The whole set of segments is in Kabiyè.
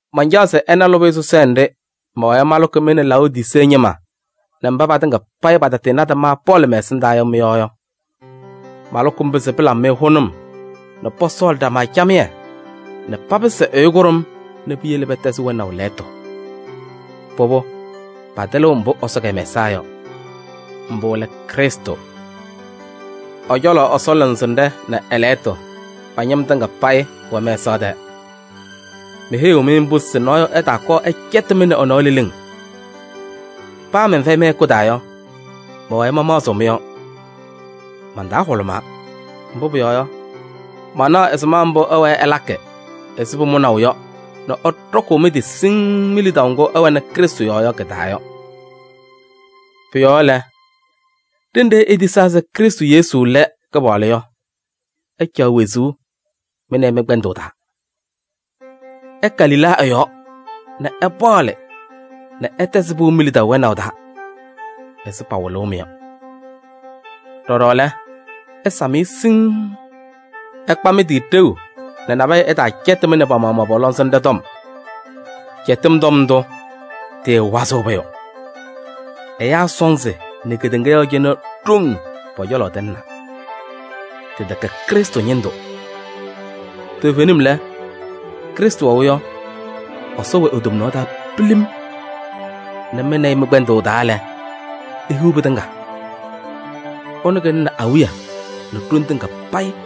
Mancaɣ se ɩna lʋbɩyɛ sɔsɔɖɛ nɖɩ mɛwɛɛ malʋkɩ mɩ nɛ Laodisee ñɩma nɛ mba patɩŋa payɩ patatɩɩnadɩ ma Pɔɔlɩ mɛ-ɛsɩndaa yɔ mɩ-yɔɔ yɔ. Malʋkɩ mbʋ se pɩlabɩ-wɛ hʋnʋm nɛ pɔsɔɔlɩ ɖama camɩyɛ nɛ papɩsɩ ɛyʋ kʋɖʋm nɛ piyele pɛtɛzɩ wɛnaʋ lɛɣtʋ. Pʋbʋ, patɩlɩɣ mbʋ Ɛsɔ kɛmɛsaa yɔ: mbʋ lɛ Krɩstʋ. Ɛ-cɔlɔ Ɛsɔ lɔŋsɩnɖɛ nɛ ɛ-lɛɣtʋ pa-ñɩm tɩŋa payɩ wɛ mɛsaɣ tɛɛ. Meheyiɣ-mɩ mbʋ se nɔɔyʋ ɛtaakɔɔ ɛcɛtɩ-mɩ nɛ ɛ-nɔɔ leleŋ. Paa mɛnfɛyɩ mɩ-hɛkʋ taa yɔ, mɛwɛɛ mamaɣzɩɣ mɩ-yɔɔ. Man-taa hʋlʋmaa, mbʋ pʋyɔɔ yɔ, manaɣ ɛzɩma mbʋ ɩwɛɛ ɩlakɩ ɛzɩ pʋmʋnaʋ yɔ nɛ ɩɖɔkʋʋ mɩ-tɩ siŋŋ mi-lidaʋ ŋgʋ ɩwɛnɩ Krɩstʋ yɔɔ yɔ kɩ-taa yɔ. Pʋ-yɔɔ lɛ, ɖenɖe itisaa se Krɩstʋ Yesu lɛ Kɩpaɣlʋ yɔ, ɩcaɣ wezuu mɩ nɛ ɩ mɩ-kpɛndʋʋ taa. Ɩka lila ɛ-yɔɔ nɛ ɩpaɣlɩ nɛ ɩtɛzɩ pɩʋ mi-lidaʋ wɛnaʋ taa ɛzɩ pawɩlʋʋ-mɩ yɔ. Ɖɔɖɔ lɛ, ɩsam-ɩ siŋŋ. Ɩkpa mɩ-tɩ ɖeu nɛ nabɛyɛ ɛtaacɛtɩ-mɩ nɛ pa-maɣmaɣ pɔ-lɔŋsɩnɖɛ tɔm. Cɛtɩm tɔm ndʋ, tɩɩwazɩɣ pʋyʋ. Ɛyaa sɔnzɩ nɛ kedeŋa yɔɔ cɩnɛ ɖoŋ pɔ-cɔlɔ tɩlɩnaa. Tɩtɛkɛ Krɩstʋ ñɩndʋ. Toovenim lɛ, Krɩstʋ wɛʋ yɔ, Ɛsɔ wɛ e-tomnaɣ taa pilim nɛ mɩ nɛ ɩ mɩ-kpɛndʋʋ taa lɛ, ihiɣ pɩtɩŋa. Ɛnʋ kɩlɩnɩ awiya nɛ ɖoŋ tɩŋa payɩ.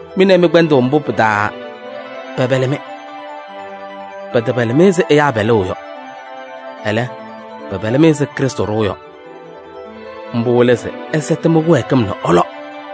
Mɩ nɛ ɩ mɩ-kpɛndʋʋ mbʋ pɩ-taa pɛpɛlɩ-mɩ. Pɛtɛpɛlɩ-mɩ ɛzɩ ɛyaa pɛlʋʋ yɔ, ɛlɛ, pɛpɛlɩ-mɩ ɛzɩ Krɩstʋ ɖʋʋ yɔ. Mbʋ lɛ se ɩsɛtɩ mɩ-kɩwɛɛkɩm nɛ ɩlɔ.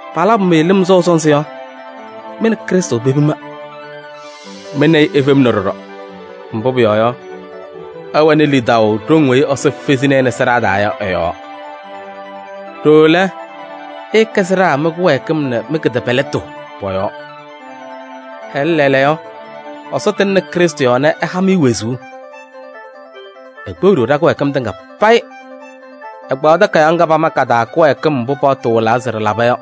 Palabʋ-mɩ lɩm sɔʋ sɔnzɩ yɔ, mɩ nɛ Krɩstʋ pepima. Mɩ nɛ ɩ ifemna ɖɔɖɔ, mbʋ pʋyɔɔ yɔ, ɩwɛnɩ lidaʋ ɖoŋ weyi Ɛsɔ fezini-i nɛ sɩɖaa taa yɔ ɛ-yɔɔ. Ɖooo lɛ, ɩɩkɛ sɩɖaa mɩ-kɩwɛɛkɩm nɛ mɩ-kɩtɛpɛlɩtʋ pɔ-yɔɔ. Ɛlɛ, lɛɛlɛɛyɔ Ɛsɔ tɩŋnɩ Krɩstʋ yɔɔ nɛ ɛha-mɩ wezuu: ekpeɣ-ɖʋ ɖa-kɩwɛɛkɩm tɩŋa payɩ. Ɛkpaɣ takayaɣ ŋga pama ka-taa kɩwɛɛkɩm mbʋ paɣtʋ wɩlaa se ɖɩlaba yɔ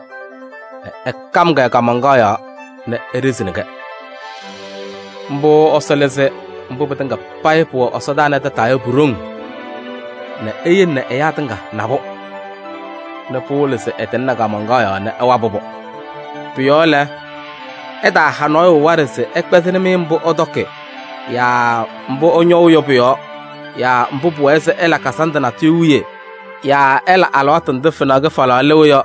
nɛ ɛkam-kɛ kaamaŋkaɣ yɔɔ nɛ eɖizini-kɛ. Mbʋ Ɛsɔ lɩzɩ mbʋ pɩtɩŋa payɩ pʋwɛ ɛsɔdaa nɛ tataa yɔ pu-ɖoŋ nɛ eyele nɛ ɛyaa tɩŋa na-pʋ nɛ pɩwɩlɩ se ɛtɩŋnɩ kaamaŋkaɣ yɔɔ nɛ ɛwabɩ-pʋ. Pʋ-yɔɔ lɛ, ɩtaaha nɔɔyʋ waɖɛ se ɛkpɛzɩnɩ-mɩ mbʋ ɩtɔkɩ yaa ɩñɔʋ yɔ pʋ-yɔɔ yaa mbʋ pʋwɛɛ se ɩla kazandʋ natʋyʋ wiye yaa ɩla alɩwaatʋ ndʋ fenaɣ kɩfalaɣ lɩɣ yɔ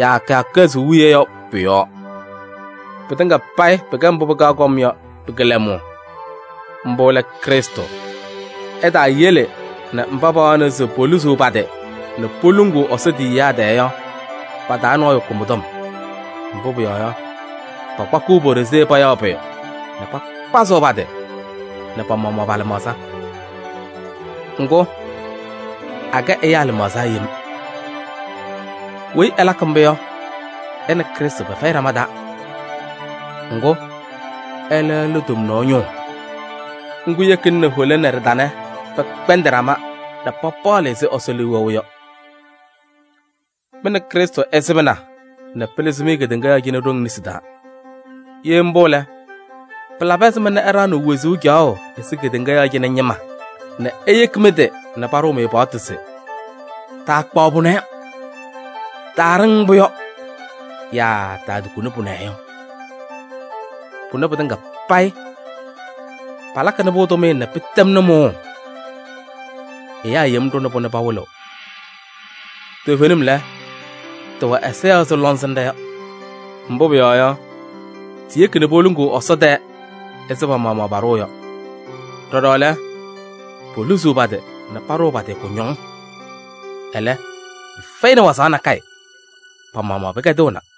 yaa kɩyakʋ kɩhɛzʋʋ wiye yɔ pʋ-yɔɔ. Pɩtɩŋa payɩ pɩkɛ mbʋ pɩkaɣ kɔm yɔ pɩ-kɩlɛmʋʋ. Mbʋ lɛ Krɩstʋ. Ɩtaayele nɛ mba pawaɣnɩ se poluzuu pa-tɩ nɛ poluŋuu Ɛsɔ tiyiyaa tɛɛ yɔ, pa-taa nɔɔyʋ kʋ mɩ-tɔm. Mbʋ pʋyɔɔ yɔ, pakpakɩɣ po-ɖozee payaɣ pʋyʋ nɛ pakpazɩɣ pa-tɩ nɛ pa-maɣmaɣ pa-lɩmaɣza. Ŋgʋ, akɛ ɛyaa lɩmaɣza yem. Weyi ɛlakɩ mbʋ yɔ, ɛ nɛ Krɩstʋ pɛfɛyɩ ɖama taa. Ŋgʋ, ɛlɛ lɛ tomnaɣ ñʋʋ. Ŋgʋ yekina nɛ hola nɛ ɖɩtanɖɛ pɛkpɛndɩ ɖama nɛ papaɣlɩ ɛzɩ Ɛsɔ liu wɛʋ yɔ. Mɩ nɛ Krɩstʋ ɩsɩbɩna nɛ pɩlɩzɩ-mɩ kedeŋa yɔɔ cɩnɛ ɖoŋ nesi taa. Ye mbʋ lɛ, pɩlabɩ ɛzɩma nɛ ɩɖaɣnɩɣ wezuu caɣʋ ɛzɩ kedeŋa yɔɔ cɩnɛ ñɩma nɛ iyeki mɩ-tɩ nɛ paɖʋʋ-mɩ paɣtʋ se: “Taakpaɣ pʋnɛ?” “Taaɖɩŋ mbʋ yɔ?” Yaa “Taatukuni pʋnɛ yɔ?” Pʋnɛ pɩtɩŋa payɩ, palakɩnɩ-pʋ tʋmɩyɛ nɛ pɩtɛmnɩ mʋʋʋ. Ɛyaa yem ɖʋnɩ-pʋ nɛ pawɩlɩɣ. Toovenim lɛ, tɩwɛ ɛza yɔɔ ɛzɩ lɔŋsɩnɖɛ yɔ. Mbʋ pʋyɔɔ yɔ, tiyeki nɛ poluŋuu Ɛsɔ tɛɛ ɛzɩ pa-maɣmaɣ paɖʋʋ yɔ. Ɖɔɖɔ lɛ, poluzuu pa-tɩ nɛ paɖʋʋ pa-tɩ kʋñɔŋ. Ɛlɛ, pɩfɛyɩnɩ wazaɣ nakɛyɛ, pa-maɣmaɣ pɩkɛdɩɣna.